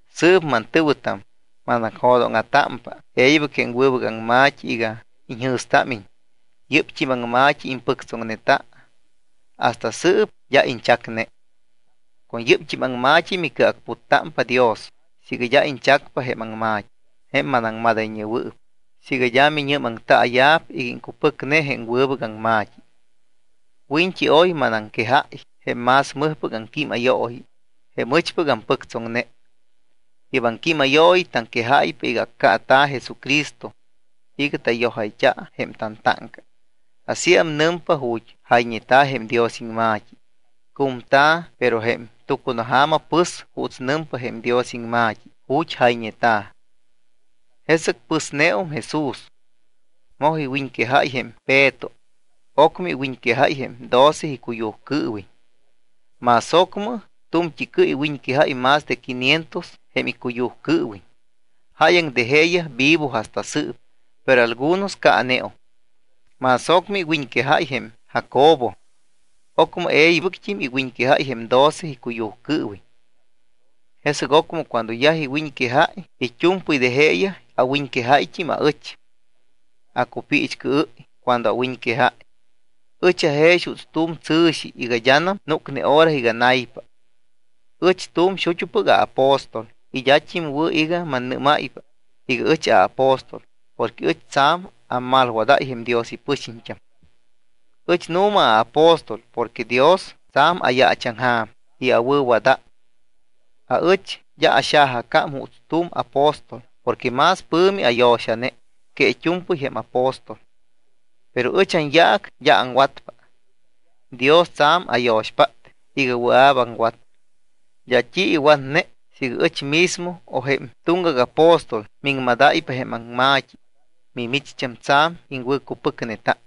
Sɨɨp mantɨ̱wɨtam, manacjo̱dóŋa̱támpa e̱ybɨc jém wɨbɨc aŋma̱t́i iga iñjɨ̱stámiñ. Yɨ́pt́im aŋma̱t́i impɨctsoŋneta, hasta sɨɨp d́a iñchacne. Con yɨ́pt́im aŋma̱t́i micɨacputtámpa Dios siiga d́a iñchacpa jém aŋma̱t́i, jém manaŋmadayñewɨɨp, siiga d́a minɨ́maŋtaaya̱p iga iŋcupɨcne jém wɨbɨc aŋma̱t́i. Wiñt́i oy manaŋquejáy jém más mɨjpɨc aŋquímayooyi, jém ɨchpɨc ampɨctsoŋne. Yɨ́p aŋquímayooyi taŋquejáypa iga accaata̱ Jesucristo iga tayojayt́a jém tantáŋca. Asíam nɨmpa ju̱t́ jayñeta̱ jém Dios iŋma̱t́i. Cumta̱, pero jém tucunaja̱ma pɨs juuts nɨmpa jém Dios iŋma̱t́i ju̱t́ jayñeta̱. Jesɨc pɨsneum Jesús, moj iwiñquejáy jém Peto, ocmɨ iwiñquejáy jém doce icuyujcɨɨwiñ. Más ocmɨ tu̱mt́i cɨ iwiñquejáy más de quinientos jém icuyujcɨɨwiñ. Jáyaŋ de jeeyaj vivo hasta sɨɨp, pero algunos caaneum. Más ocmɨ iwiñquejáy jém Jacobo. Ocmɨ e̱ybɨct́im iwiñquejáy jém doce icuyujcɨɨwiñ. Jesɨc ocmɨ cuando yaj iwiñquejáy it́u̱mpɨy de jeeyaj, awiñquejáyt́im aɨch. Acupiichcɨɨ́y cuando awiñquejáy. Ɨch ajex juuts tu̱m tsɨ̱xi iga d́anam núcne hora iga naypa. Ɨch tu̱m xut́upɨc aapóstol y d́at́im wɨ̱ iga mannɨ́máypa iga ɨch aapóstol porque ɨch tsa̱m ammalwadáy jém Dios ipɨxiñt́am. Ɨch nu̱ma aapóstol porque Dios tsa̱m ayaachaŋja̱m y awɨ̱wadáy. Aɨch d́a axajacám juuts tu̱m apóstol porque más pɨ̱mi ayo̱xane que it́u̱mpɨy jém apóstol. Pero ɨch anyaac d́a aŋwatpa. Dios tsa̱m ayo̱xpát iga wɨa̱p aŋwat. D́a t́i iwatne siiga ɨch mismo o jém tuŋgac apóstol miŋmadáypa jém aŋma̱t́i, mimicht́am tsa̱m iŋwɨ̱cupɨcneta.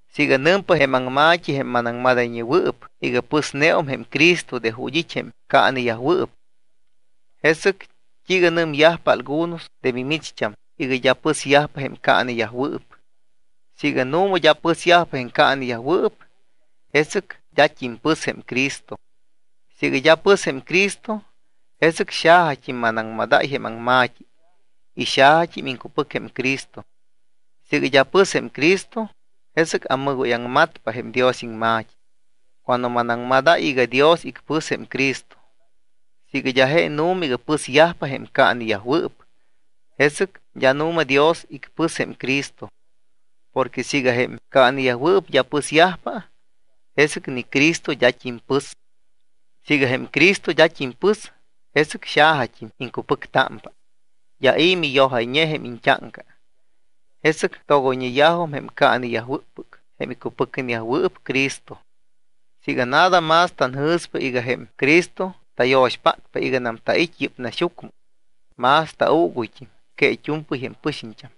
Siiga nɨmpa jém aŋma̱t́i, jém manaŋmadayñewɨɨp, iga pɨsneum jém Cristo de ju̱t́ it́ jém caaneyajwɨɨp, ¿jesɨc t́iiga nɨmyajpa algunos de mimicht́am iga d́a pɨsyajpa jém caaneyajwɨɨp? Siiga nu̱ma d́a pɨsyajpa jém caaneyajwɨɨp, jesɨc d́at́im pɨs jém Cristo. Siiga d́a pɨs jém Cristo, jesɨc xajat́im manaŋmadáy jém aŋma̱t́i y xajat́im iŋcupɨc jém Cristo. Siiga d́a pɨs jém Cristo, jesɨc ammɨgóyaŋmatpa jém Dios iŋma̱t́i cuando manaŋmadáy iga Dios icpɨs jém Cristo. Siiga d́a je nu̱ma iga pɨsyajpa jém caaneyajwɨɨp, jesɨc d́a nu̱ma Dios icpɨs jém Cristo. Porque siiga jém caaneyajwɨɨp d́a pɨsyajpa, jesɨc ni Cristo d́at́im pɨs. Siiga jém Cristo d́at́im pɨs, jesɨc xajat́im iŋcupɨctámpa, d́a i̱ miyojayñe jém iñt́áŋca. Jesɨc togoyñeyajum jém caaneyajwɨ́ppɨc, jém icupɨcneyajwɨɨp Cristo. Siiga nada más tanjɨ̱spa iga jém Cristo tayo̱xpátpa iganam tait́pa yɨ́p naxyucmɨ, más tauuguyt́im que it́u̱mpɨy jém pɨxiñt́am.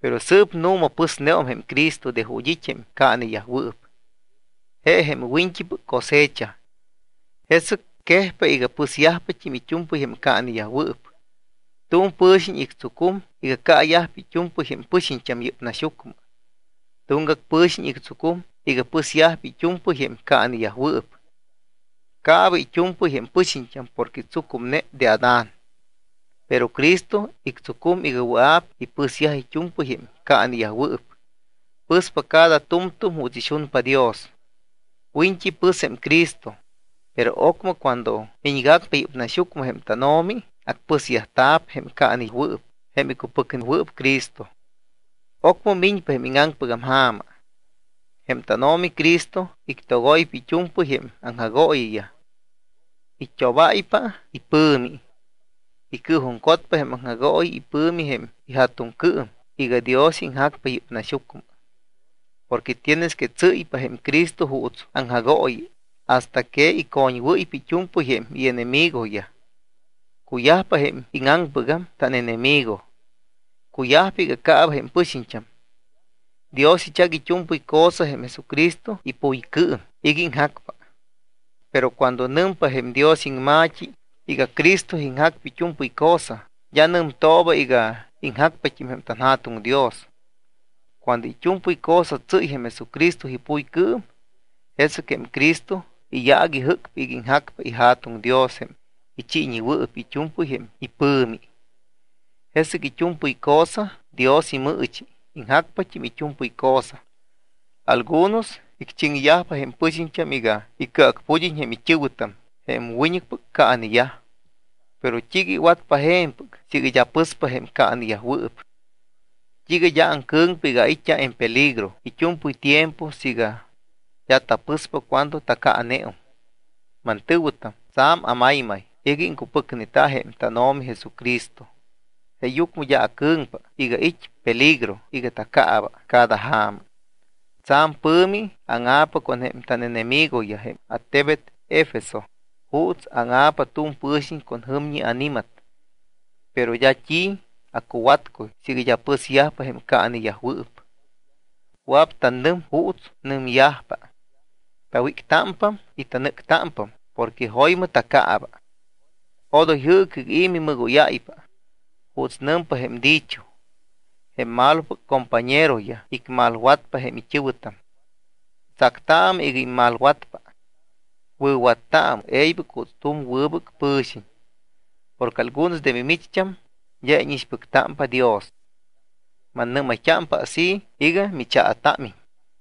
Pero sɨɨp nu̱ma pɨsneum jém Cristo de ju̱t́ it́ jém caaneyajwɨɨp. Je jém wiñt́ipɨc cosecha. Jesɨc quejpa iga pɨsyajpat́im it́u̱mpɨy jém caaneyajwɨɨp. Tu̱m pɨ̱xiñ ictsucum iga caayajpa it́u̱mpɨy jém pɨxiñt́am yɨ́p naxyucmɨ. Tuŋgac pɨ̱xiñ ictsucum iga pɨsyajpa it́u̱mpɨy jém caaneyajwɨɨp. Caaba it́u̱mpɨy jém pɨxiñt́am porque tsucumne de Adán. Pero Cristo ictsucum iga wɨa̱p ipɨsyaj it́u̱mpɨy jém caaneyajwɨɨp. Pɨspa cada tu̱mtu̱m juuts ixunpa Dios. Wiñt́i pɨs jém Cristo, pero ocmɨ cuando miñgacpa yɨ́p naxyucmɨ jém tánO̱mi, acpɨsyajta̱p jém caanewɨɨp, jém icupɨcnewɨɨp Cristo. Ocmɨ miñpa jém íŋaŋpɨgam ja̱ma. Jém tánO̱mi Cristo ictogoypa it́u̱mpɨy jém aŋjagooyiyaj. It́obáypa ipɨ̱mi. Icɨɨjuŋcotpa jém aŋjagooyi ipɨ̱mi jém iJa̱tuŋcɨɨm iga Dios iŋjacpa yɨ́p naxyucmɨ. Porque tienes que tsɨ́ypa jém Cristo juuts aŋjagooyi hasta que icoñwɨ́ypa it́u̱mpɨy jém ienemigoyaj. Cuyajpa jém íŋaŋpɨgam tánenemigo. Cuyajpa iga caaba jém pɨxiñt́am. Dios ichac it́u̱mpɨy cosa jém Jesucristo ipuycɨɨm iga iŋjacpa. Pero cuando nɨmpa jém Dios iŋma̱t́i iga Cristo iŋjacpa it́u̱mpɨy cosa, d́a nɨmtooba iga iŋjacpat́im jém tanJa̱tuŋ Dios. Cuando it́u̱mpɨy cosa tsɨ́y jém Jesucristo ipuycɨɨm, jesɨc jém Cristo iyaac ijɨ́cpa iga iŋjacpa iJa̱tuŋ Dios, jém ichiiñewɨɨp it́u̱mpɨy jém ipɨ̱mi. Jesɨc it́u̱mpɨy cosa Dios imɨɨchi, iŋjacpat́im it́u̱mpɨy cosa. Algunos icchiŋyajpa jém pɨxiñt́am iga icɨacpud́iñ jém it́ɨ̱wɨtam jém wiñɨcpɨc caaneyaj. ¿Pero t́iiga iwatpa je̱mpɨc siiga d́a pɨspa jém caanewɨɨp? ¿T́iiga d́a acɨ̱ŋpa iga ait́t́a en peligro it́u̱mpɨy tiempo siiga d́a tapɨspa cuando tacaaneum? Mantɨ̱wɨtam, tsa̱m amaymay iga iŋcupɨcneta jém tánO̱mi Jesucristo. Jeeyucmɨ d́a acɨ̱ŋpa iga it́ peligro iga taccaaba cada ja̱ma. Tsa̱m pɨ̱mi anáŋa̱pa con jém ánenemigoyaj jém attebet Efeso juuts áŋa̱pa tu̱m pɨ̱xiñ con jɨmñi ani̱mat, pero d́a t́i acuwatcuy siiga d́a pɨsyajpa jém caaneyajwɨɨp. Wɨa̱p tanɨm juuts nɨmyajpa: “Tawíctámpam y tanɨ́ctámpam porque jo̱ymɨ tacaaba.” Odoy jɨɨcɨ iga i̱ mimɨgóyáypa. Juuts nɨmpa jém dicho: “Jém malopɨc compañeroyaj icmalwatpa jém it́ɨ̱wɨtam.” Tsactaamɨ iga immalwatpa. Wɨ̱wattaamɨ e̱ybɨc juuts tu̱m wɨbɨc pɨ̱xiñ. Porque algunos de mimicht́am d́a íñixpɨctámpa Dios. Mannɨ́mayt́ámpa así iga michaatámiñ.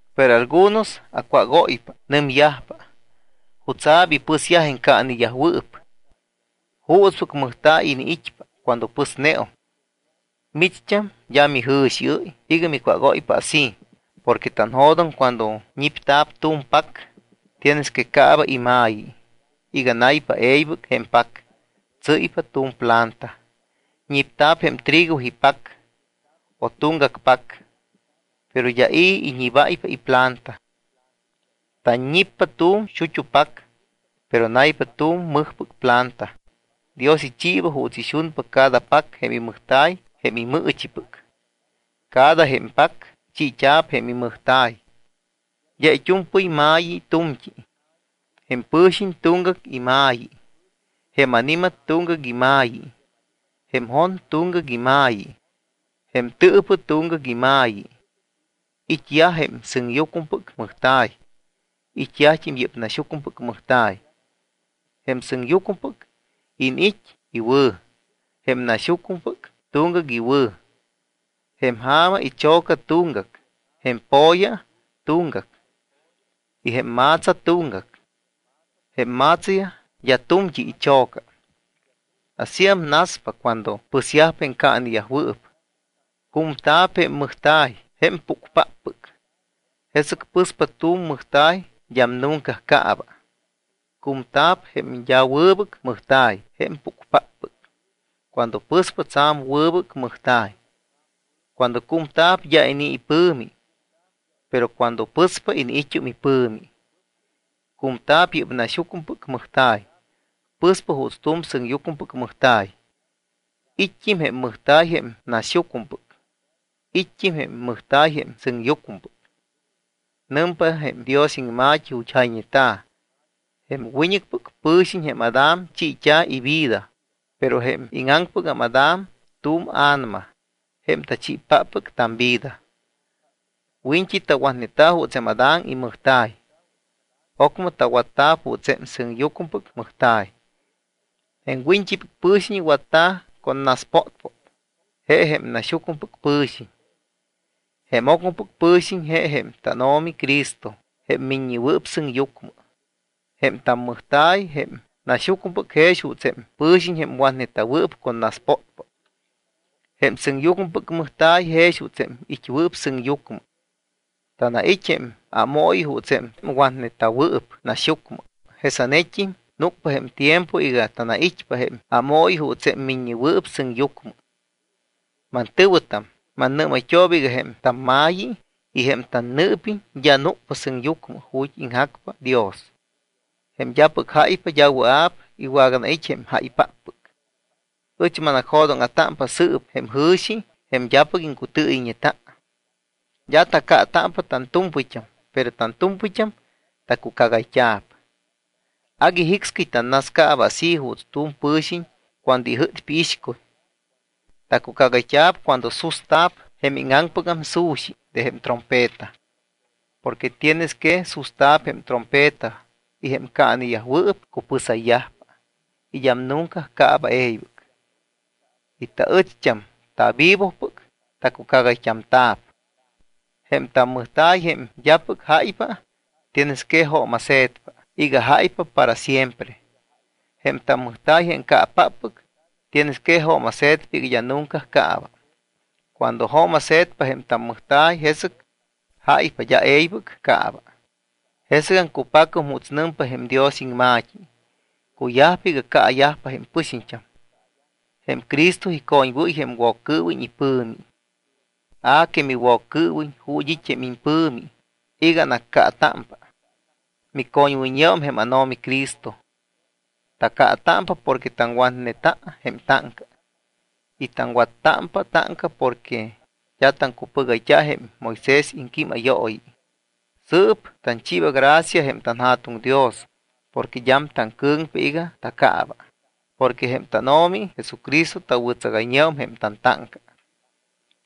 Pero algunos acwágóypa, nɨmyajpa: “¿Jutsa̱p ipɨsyaj jém caaneyajwɨɨp? ¿Juutspɨc mɨjta̱y iniit́pa cuando pɨsneum?” Micht́am d́a mijɨ̱xiɨ́y iga micwágóypa así porque tanjo̱doŋ cuando ñipta̱p tu̱m pac tienes que caaba ima̱yi iga naypa e̱ybɨc jém pac, tsɨ́ypa tu̱m planta. Ñipta̱p jém trigo ipac o tuŋgac pac, pero d́a i̱ iñibáypa iplanta. Tanñippa tu̱m xut́u pac, pero naypa tu̱m mɨjpɨc planta. Dios ichiiba juuts ixunpa cada pac jém imɨjta̱y jém imɨɨchipɨc. Cada jém pac chiit́a̱p jém imɨjta̱y. D́a it́u̱mpɨy ma̱yi tu̱mt́i. Jém pɨ̱xiñ tuŋgac ima̱yi, jém ani̱mat tuŋgac ima̱yi, jém jon tuŋgac ima̱yi, jém tɨɨpɨ tuŋgac ima̱yi. It́yaj jém sɨŋyucmɨpɨc mɨjta̱y, it́yajt́im yɨ́p naxyucmɨpɨc mɨjta̱y. Jém sɨŋyucmɨpɨc iniit́ iwɨ̱. Jém naxyucmɨpɨc tuŋgac iwɨ̱. Jém ja̱ma icho̱ca tuŋgac, jém po̱ya tuŋgac, y jém ma̱tsa tuŋgac. Jém ma̱tsayaj d́a tu̱mt́i icho̱ca. Asíam naspa cuando pɨsyajpa jém caaneyajwɨɨp. Cumta̱p jém mɨjta̱y jém púcpáppɨc. Jesɨc pɨspa tu̱m mɨjta̱y d́am nunca caaba. Cumta̱p jém d́a wɨbɨc mɨjta̱y jém pucpáppɨc. Cuando pɨspa, tsa̱m wɨbɨc mɨjta̱y. Cuando cumta̱p d́a inii̱ ipɨ̱mi. Pero cuando pɨspa iniit́um ipɨ̱mi. Cumta̱p yɨ́p naxyucmɨpɨc mɨjta̱y. Pɨspa juuts tu̱m sɨŋyucmɨpɨc mɨjta̱y. It́t́im jém mɨjta̱y jém naxyucmɨpɨc. It́t́im jém mɨjta̱y jém sɨŋyucmɨpɨc. Nɨmpa jém Dios iŋma̱t́i ju̱t́ jayñeta̱: “Jém wiñt́ipɨc pɨ̱xiñ, jém Adán, chiit́a̱ ivida.” Pero jém íŋaŋpɨgam Adán tu̱m A̱nama, jém tachiipáppɨc tamvida. Wiñt́i tawatneta̱ juuts jém Adán imɨjta̱y, ocmɨ tawatta̱p juuts jém sɨŋyucmɨpɨc mɨjta̱y. Jém wiñt́ipɨc pɨ̱xiñ watta̱ con naspótpót, je jém naxyucmɨpɨc pɨ̱xiñ. Jém ocmɨpɨc pɨ̱xiñ je jém tánO̱mi Cristo jém Miññewɨɨp Sɨŋyucmɨ. Jém tammɨjta̱y, jém naxyucmɨpɨc, jex juuts jém pɨ̱xiñ jém watneta̱wɨɨp con naspótpót. Jém sɨŋyucmɨpɨc mɨjta̱y jex juuts jém it́wɨɨp sɨŋyucmɨ. Tanait́ jém ámooyi juuts jém watneta̱wɨɨp naxyucmɨ, jesanet́im núcpa jém tiempo iga tanait́pa jém ámooyi juuts jém Miññewɨɨp Sɨŋyucmɨ. Mantɨ̱wɨtam, mannɨ́mayt́ooba iga jém tamma̱yi y jém tannɨɨpiñ d́a núcpa sɨŋyucmɨ ju̱t́ iŋjacpa Dios. Jém d́apɨc jáypa d́a wɨa̱p iwaganait́ jém jáypáppɨc. Ɨch manacjo̱dóŋa̱támpa sɨɨp jém jɨ̱xi, jém d́apɨc iŋcutɨɨyɨyñeta. D́a tacaatámpa tantu̱mpɨyt́am, pero tantu̱mpɨyt́am tacucagayt́amta̱p. Agui jicscɨy tanascaaba así juuts tu̱m pɨ̱xiñ cuando ijɨ́tpa iixcuy. Tacucagayt́a̱p cuando susta̱p jém íŋaŋpɨgam su̱xi de jém trompeta. Porque tienes que susta̱p jém trompeta y jém caaneyajwɨɨp cupɨsayyajpa y d́am nunca caaba e̱ybɨc. Y taɨcht́am tavivopɨc tacucagayt́amta̱p. Jém tammɨjta̱y jém d́apɨc jáypa tienes que jooma̱se̱tpa iga jáypa para siempre. Jém tammɨjta̱y jém caapáppɨc tienes que jooma̱se̱tpa iga d́a nunca caaba. Cuando jooma̱se̱tpa jém tammɨjta̱y, jesɨc jáypa, d́a e̱ybɨc caaba, jesɨgam cupacum juuts nɨmpa jém Dios iŋma̱t́i: “Cuyajpa iga caayajpa jém pɨxiñt́am. Jém Cristo icoñwɨ́y jém Woccɨɨwiñ ipɨ̱mi. A que miWoccɨɨwiñ, ¿ju̱t́ it́ jém impɨ̱mi iga anaccaatámpa? Micoñwɨyñeum jém ánO̱mi Cristo.” Tacaatámpa porque taŋwatneta jém táŋca. Y taŋwattámpa táŋca porque d́a taŋcupɨgayt́a jém Moisés iŋquímayooyi. Sɨɨp tanchiiba gracia jém tanJa̱tuŋ Dios porque d́am taŋcɨ̱ŋpa iga tacaaba porque jém tánO̱mi Jesucristo tawɨ̱tsagayñeum jém tantáŋca.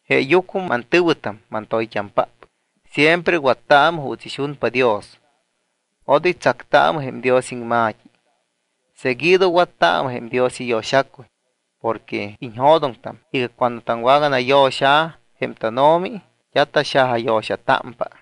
Jeeyucmɨ, mantɨ̱wɨtam mantoyt́ampáppɨc, siempre wattaamɨ juuts ixunpa Dios, odoy tsactaamɨ jém Dios iŋma̱t́i. Seguido wattaamɨ jém Dios iyo̱xacuy porque iñjo̱doŋtam iga cuando taŋwaganayo̱xa̱ jém tánO̱mi, d́a taxajayo̱xatámpa.